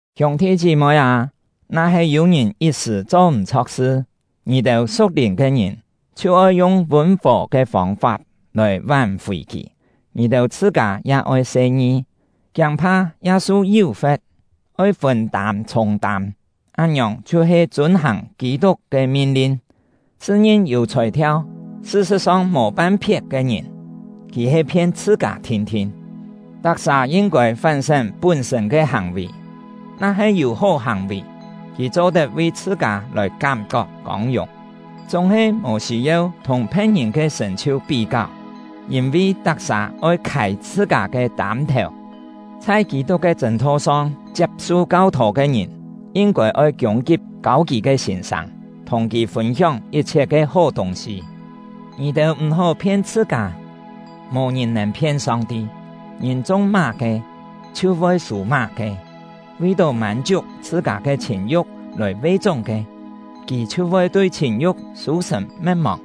Hiûng-thi chí-moi â, na-he yû-ngìn yit sṳ̀ cho m̀-chho̍k sṳ, ngì-têu su̍k-lìn ke ngìn chhiu oi yung vûn-fò ke fông-fap lòi ván-fì kì. Ngì-têu chhṳ-kâ ya oi se-ngi, kiâng-pha ya su yú-fe̍t. Oi fûn-tâm chhûng-tâm, án-ngiòng chhiu-he chûn-hàng Kî-tuk ke min-lin. Chhṳ-ngin yû chhòi-thiau, sṳ-sṳ̍t-song mò pan-phiet ke ngìn, kì he phien chhṳ-kâ thin-thin. Tak-sà yin-kôi fán-sén pún-sṳ̂n ke hàng-vì; na-he yû hó hàng-vì, kì cho-tet vi chhṳ-kâ lòi kám-kok kông-yùng, chúng-he mò sî-yeu thùng phe̍t-ngìn ke sṳ̀n-chhiu pí-káu. Yîn-vi tak-sà oi khâi chhṳ-kâ ke tâm-thèu. Chhai Kî-tuk ke chṳ̂n-tho-song chiap-su kau-thô ke ngìn, yin-kôi oi kiûng-kip kâu kì ke sîn-sâng, thùng kì fûn-hióng yit-chhiet ke hó tûng-sî. Ngì-têu m̀-hó phien chhṳ-kâ; mò ngìn nèn phien Song-ti. Ngìn chung má-ke, chhiu voi sû má-ke. Vi-tó mân-chiuk chhṳ-kâ ke chhìn-yu̍k lòi ve-chúng ke, kì chhiu voi tui chhìn-yu̍k sû-sṳ̀n me̍t-mòng;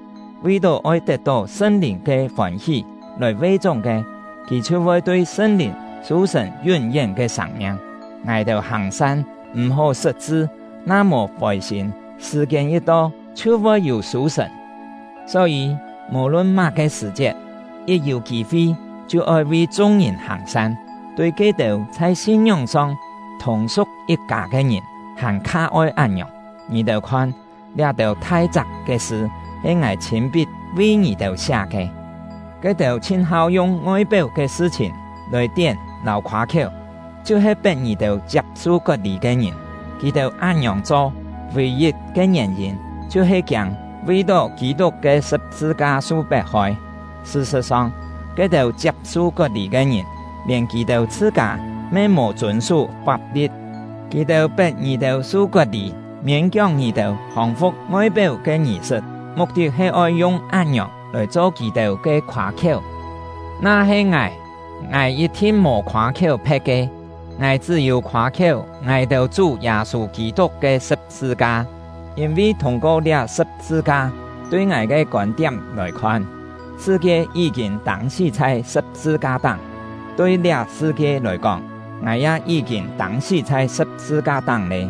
vi-tó oi tet-tó Sṳn-Lìn ke fôn-hí lòi ve-chúng ke, kì chhiu voi tui Sṳn-Lìn sû-sṳ̀n yún-yén ke sâng-miang. Ngài-têu hàng-san, m̀-hó sṳt-chṳ; na mò fôi-sîm, sṳ̀-kiên yit to, chhiu voi yû sû-sṳ̀n. Só-yî, mò-lun má-ke sṳ̀-chiet, yit yû kî-fi chhiu oi vi chung-ngìn hàng-san, tui ke-têu chhai sin-ngióng-song thùng-su̍k yit-kâ ke ngìn hàn-kha oi án-ngiòng. Ngì-têu khon, liá-têu thai-chak ke sṳ he ngài chhîn-pit vi ngì-têu siá ke! Ke-têu chhin-hau yung ngoi-péu ke sṳ-chhìn lòi tién lâu khoâ-khiéu, chhiu he pet ngì-têu chiap-su kot-lî ke ngìn. Kì-têu án-ngiòng cho, vì-yit ke ngièn-yîn chhiu-he kiâng vi-tó Kî-tuk ke sṳ̍p-sṳ-ka su pet-hoi. Sṳ-sṳ̍t-song, ke-têu chiap-su kot-lî ke ngìn, lièn kì-têu chhṳ-kâ me mò chûn-sú fap-li̍t; kì-têu pet ngì-têu su kot-lî, miên-kióng ngì-têu hòng-fu̍k ngoi-péu ke ngì-sṳt, muk-tit he oi yung án-ngiòng lòi cho kì-têu ke khoâ-khiéu. Na-he ngài, ngài yit-thin mò khoâ-khiéu phe̍t ke, ngài chṳ́-yû khoâ-khiéu ngài-têu Chú Yâ-sû Kî-tuk ke sṳ̍p-sṳ-ka; yîn-vi thûng-ko liá sṳ̍p-sṳ-ka “liá sṳ̍p-sṳ-ka” ya-he yi̍t-cho “Kî-tuk”., tui ngài ke kôn-tiám lòi khon, sṳ-kie yí-kîn tâng-sí chhai sṳ̍p-sṳ-ka-táng; tui liá sṳ-kie lòi kóng, ngài ya yí-kîn tâng-sí chhai sṳ̍p-sṳ-ka-táng lé.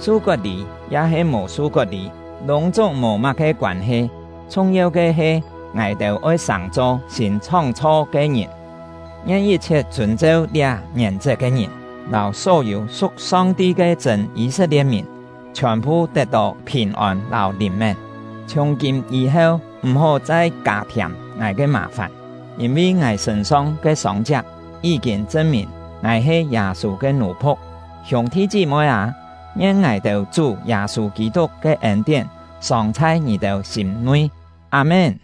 Su kot-lî ya-he mò su kot-lî lûng-chúng mò má-ke koân-he; chhung-yeu ke he ngài-têu oi sàng-cho sîn chhóng-chho ke ngìn. Ngien yit-chhiet chûn-cheu liá ngièn-chet ke ngìn, lâu só-yû su̍k Song-ti ke chṳ̂n Yî-set-lie̍t-mìn, chhiòn-phu tet-tó phìn-ôn lâu lìn-mén! Chhiùng-kîm yî-heu, m̀-hó chai kâ-thiâm ngài ke mà-fàn; yîn-vi ngài sṳ̂n-song ke sông-chiak yí-kîn chṳn-mìn ngài he Yâ-sû ke nù-phu̍k. Hiûng-thi chí-moi â, ngien ngài-têu Chú Yâ-sû Kî-tuk ke ên-tién sòng chhai ngì-têu sîm-nui! Â-mén.